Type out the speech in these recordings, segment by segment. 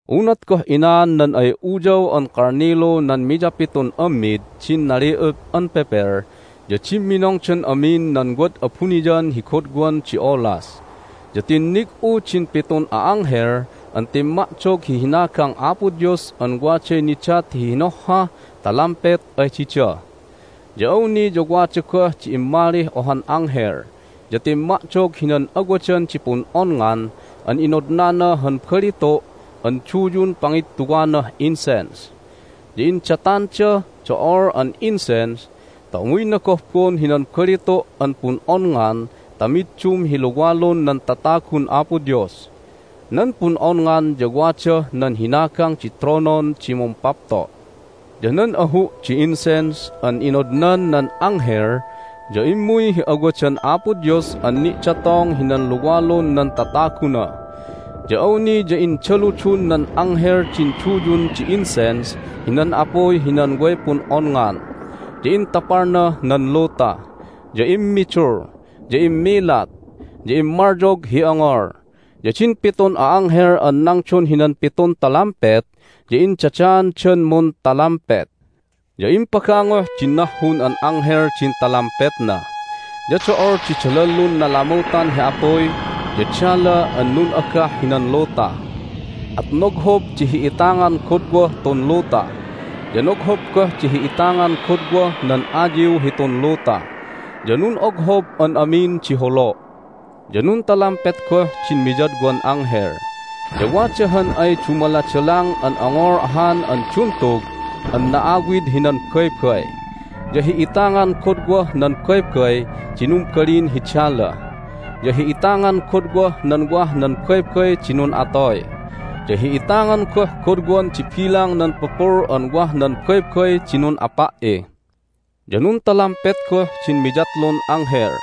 Unat goh inaan nan ay Uyaw an Kalnilu nan miyapitun ammid din nali'up an pepel ya dimminongdan amin nan wad abuniyan hi godwan di olas. Ya tinnig'u din pitun a'anghel an timma'dog hi hinagang Apo Dios an waday nidat hi hinohhah talampet ay dida. Ya awni ya wada goh di immalih ohan anghel, ya timma'dog hinan awadan di pun'onngan an inodnana han balitu' an duyun pangittuwanah incense. Ya indatandah do'ol an incense ta umuyna gohbon hinan balitu' an pun'onngan ta middum hi luwalun nan tatagun Apo Dios. Nan pun'onngan ya wadah nan hinagang di tronon di Mumpapto'. Ya nan ahu' di incense an inodnan nan anghel ya immuy hi awadan Apo Dios an ni'datong hinan luwalun nan tataguna. Ya awni ya indaludun nan anghel din duyun di incense hinan apuy hinan way pun'onngan, ya intapalnah nan luta, ya immidul, ya immilat, ya immalyog hi ongol. Ya din pitun a'anghel an nangdon hinan pitun talampet ya indadaandan muntalampet. Ya impagangoh din nahhun an anghel din talampetna, ya do'ol di dalallun nalamutan hi apuy ya dala an nun'agah hinan luta. At noghob di hi'itangan godwah tun luta, ya noghob goh di hi'itangan godwah nan ayiw hitun luta, ya nun'oghob an amin di holo'. Ya nuntalampet goh din miyadwan anghel, ya wada han ay dumaladalang an ongol ahan an duntug an na'awid hinan baybay. Ya hi'itangan godwah nan baybay di numbalin hi dala, ya hi'itangan godwah nan wah nan baybay di nun'atoy, ya hi'itangan goh godwan di bilang nan pupul an wah nan baybay di nun'apa"i. Ya nuntalampet goh din miyatlun anghel,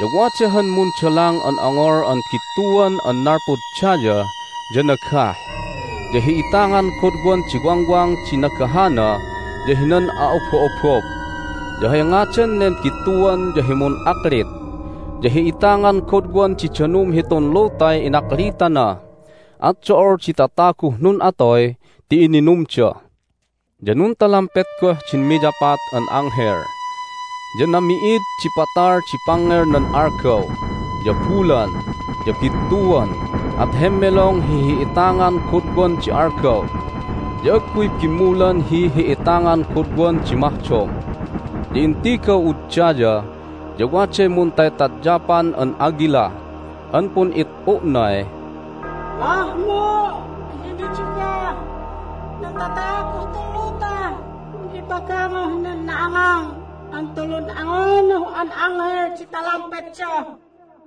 ya wada han mundalang an ongol an bittuan an nalpud daya, ya nagah, ya hi'itangan godwan di wangwang di nagahana ya hinan a'obo'obob. Ya hay ngadan nen bittuan ya hi Mun'aklit. Ya hi'itangan godwan di danum hitun lutay inaklitana, at do'ol di tataguh nun'atoy ti ininumda. Ya nuntalampet goh din miyapat an anghel. Ya nami'id di patal di pangngel nan algaw, ya bulan, ya bittuan, at hemmelong hi hi'itangan godwan di algaw, ya agguy bimmulan hi hi'itangan godwan di mahdom. Ya intigaw'ud daya, ya waday muntaytadyapan an agila an pun'it'u'nay, "Mahmo' hi nidugah nan tataguh tun lutah un ipagangoh nan na'angang an tulun angunuh an anghel di talampetda!"